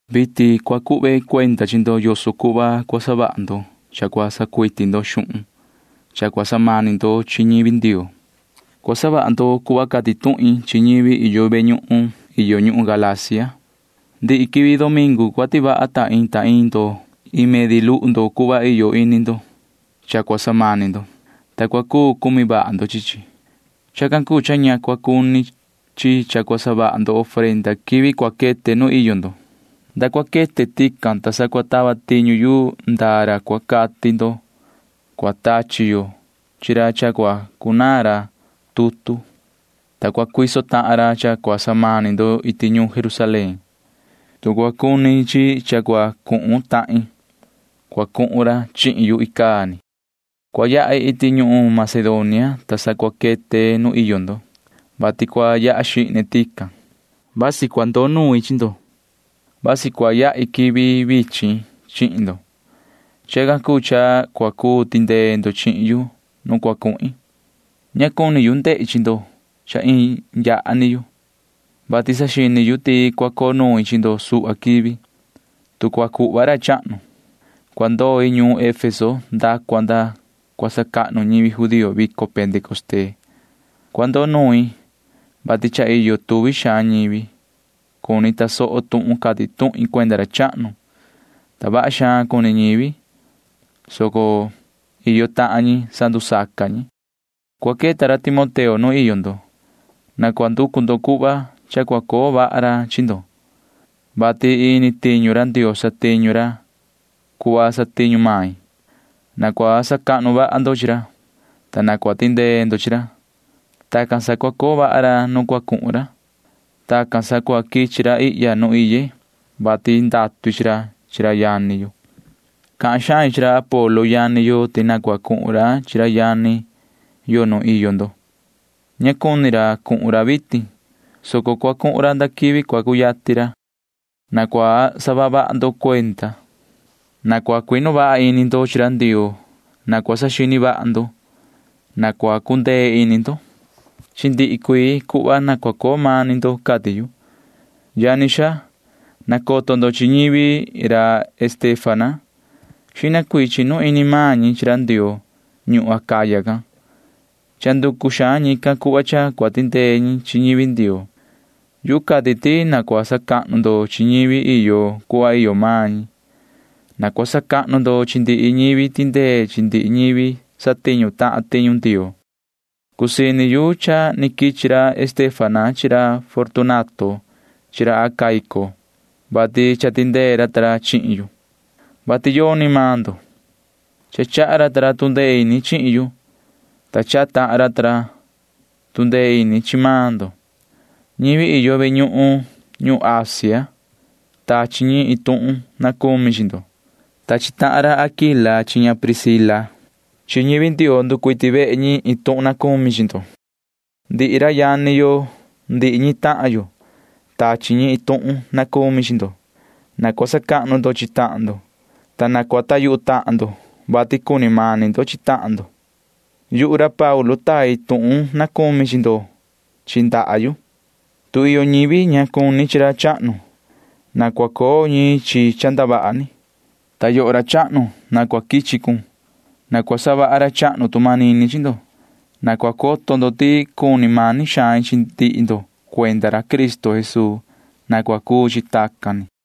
Vitin cua cuhve cuenda chi ndo yoso cuhva cua savaha ndo cha cua sacuiti ndo xuhun cha cua samani ndo chi ñivi Ndioo. Cua savaha ndo cuhva cati tuhin chi ñivi iyo ve ñuhun iyo ñuhun Galacia. Ndihi quivi domingu cua tivaha ta iin ta iin ndo iin medi luhu ndo cuhva iyo ini ndo cha cua samani ndo, ta cua cu cumi vaha ndo chi chi. Chacan cuu cha ña cua cuni chi cha cua savaha ndo ofrenda quivi cua quete nu iyo ndo. Nda cua quete tican, ta sa cua tava tiñu yu ndaa ra cua cati ndo. Cua tachi yo chi ra cha cua cunaan ra tutu, ta cua cuiso tahan ra cha cua samani ndo iti ñuun Jerusalén. Tu cua cuni chi cha cua cuhun tahin, cua cuhun ra chihin yu icaa ni. Cua yahi iti ñuhun Macedonia, ta sa cua quete nu iyo ndo, vati cua yaha xihne tican. Vasi cua ndoo nuin chi ndo. Vasi cua yahi quivi vichin chihin ndo. Chacan cuu cha cua cuu tindee ndo chihin yu nu cua cuhin. Ña cuni yu ndehi chi ndo cha iin yaha ni yu, vati saxini yu ti cua coo nuin chi ndo suhva quivi, tu cua cuhva ra chahnu. Cua ndoi ñuun Efeso nda cua nda cua sacahnu ñivi judío vico pentecostee. Cua ndoo nuin, vati cha iyo tuvi xaan ñivi cuni tasoho tuhun cati tuhin cuenda ra chahnu, ta vaha xaan cuni ñivi, soco iyo tahan ñi sandusaca ñi. Cua queta ra Timoteo nu iyo ndo. Na cua nducu ndo cuhva cha cua coo vaha ra chi ndo, vati ini tiñu ra Ndioo satiñu ra cuhva satiñu main. Na cua sacahnu vaha ndo chi ra, ta na cua tindee ndo chi ra. Tacan sa cua coo vaha ra nu cua cuhun ra. Tacan sa cua quichi ra ihya nu iye, vati ndatu i chi ra chi ra yani yo. Cahan xain chi ra Apolo yani yo ti na cua cuhun ra chi ra yani yo nu iyo ndo. Ña cuni ra cuhun ra vitin, soco cua cuhun ra ndaa quivi cua cuyatin ra. Na cua saha vaha ndo cuenda. Na cua cuinu vaha ini ndo chi ra Ndioo. Na cua saxini vaha ndo. Na cua cundee ini ndo. Chi ndihi cuii cuhva na cua coo mani ndo, cati yu. Yani xaa, nacoto ndo chi ñivi ra Estéfana. Xihna cuii chinu ini maan ñi chi ra Ndioo ñuhun Acaya can. Cha nducu xaan ñican cuhva cha cua tindee ñi chi ñivi Ndioo. Yu cati ti na cua sacahnu ndo chi ñivi iyo cuhva iyo maan ñi. Na cua sacahnu ndo chi ndihi ñivi tindee chi ndihi ñivi satiñu tahan tiñu Ndioo. Cusii ini yu cha ni quichi ra Estéfana chi ra Fortunato chi ra Acaico, vati cha tindee ra ta ra chihin yu, vati yoni maan ndo. Cha chaha ra ta ra tu ndee ini chihin yu, ta chaha tahan ra ta ra tu ndee ini chi maan ndo. Ñivi iyo ve ñuhun ñuhun Asia―tachi ñi iin tuhun na cumi chi ndo. Tachi tahan ra Aquila chi ña Priscila chi ñivi Ndioo nducuiti vehe ñi iin tuhun na cumi chi ndo. Ndihi ra yani yo ndihi ñi tahan yo―tachi ñi iin tuhun na cumi chi ndo. Na cua sacahnu ndo chi tahan ndo, ta cua coho ndo yuhu tahan ndo, [vati cuni mani ndo chi tahan ndo]. Yuhu ra Paulu tai tuhun na cumi chi ndo chi ndaha yu. Tu iyo ñivi ña cuni chi ra chahnu, na cua coo ñi chi cha ndavaha ni, ta yoho ra chahnu, na cua quichi cun. Na cua savaha ra chahnu tu manini chi ndo. Na cua coto ndo ti cuni mani xain chi ndihi ndo cuenda ra Cristo Jesuu. Na cua cuu chi tacan ni.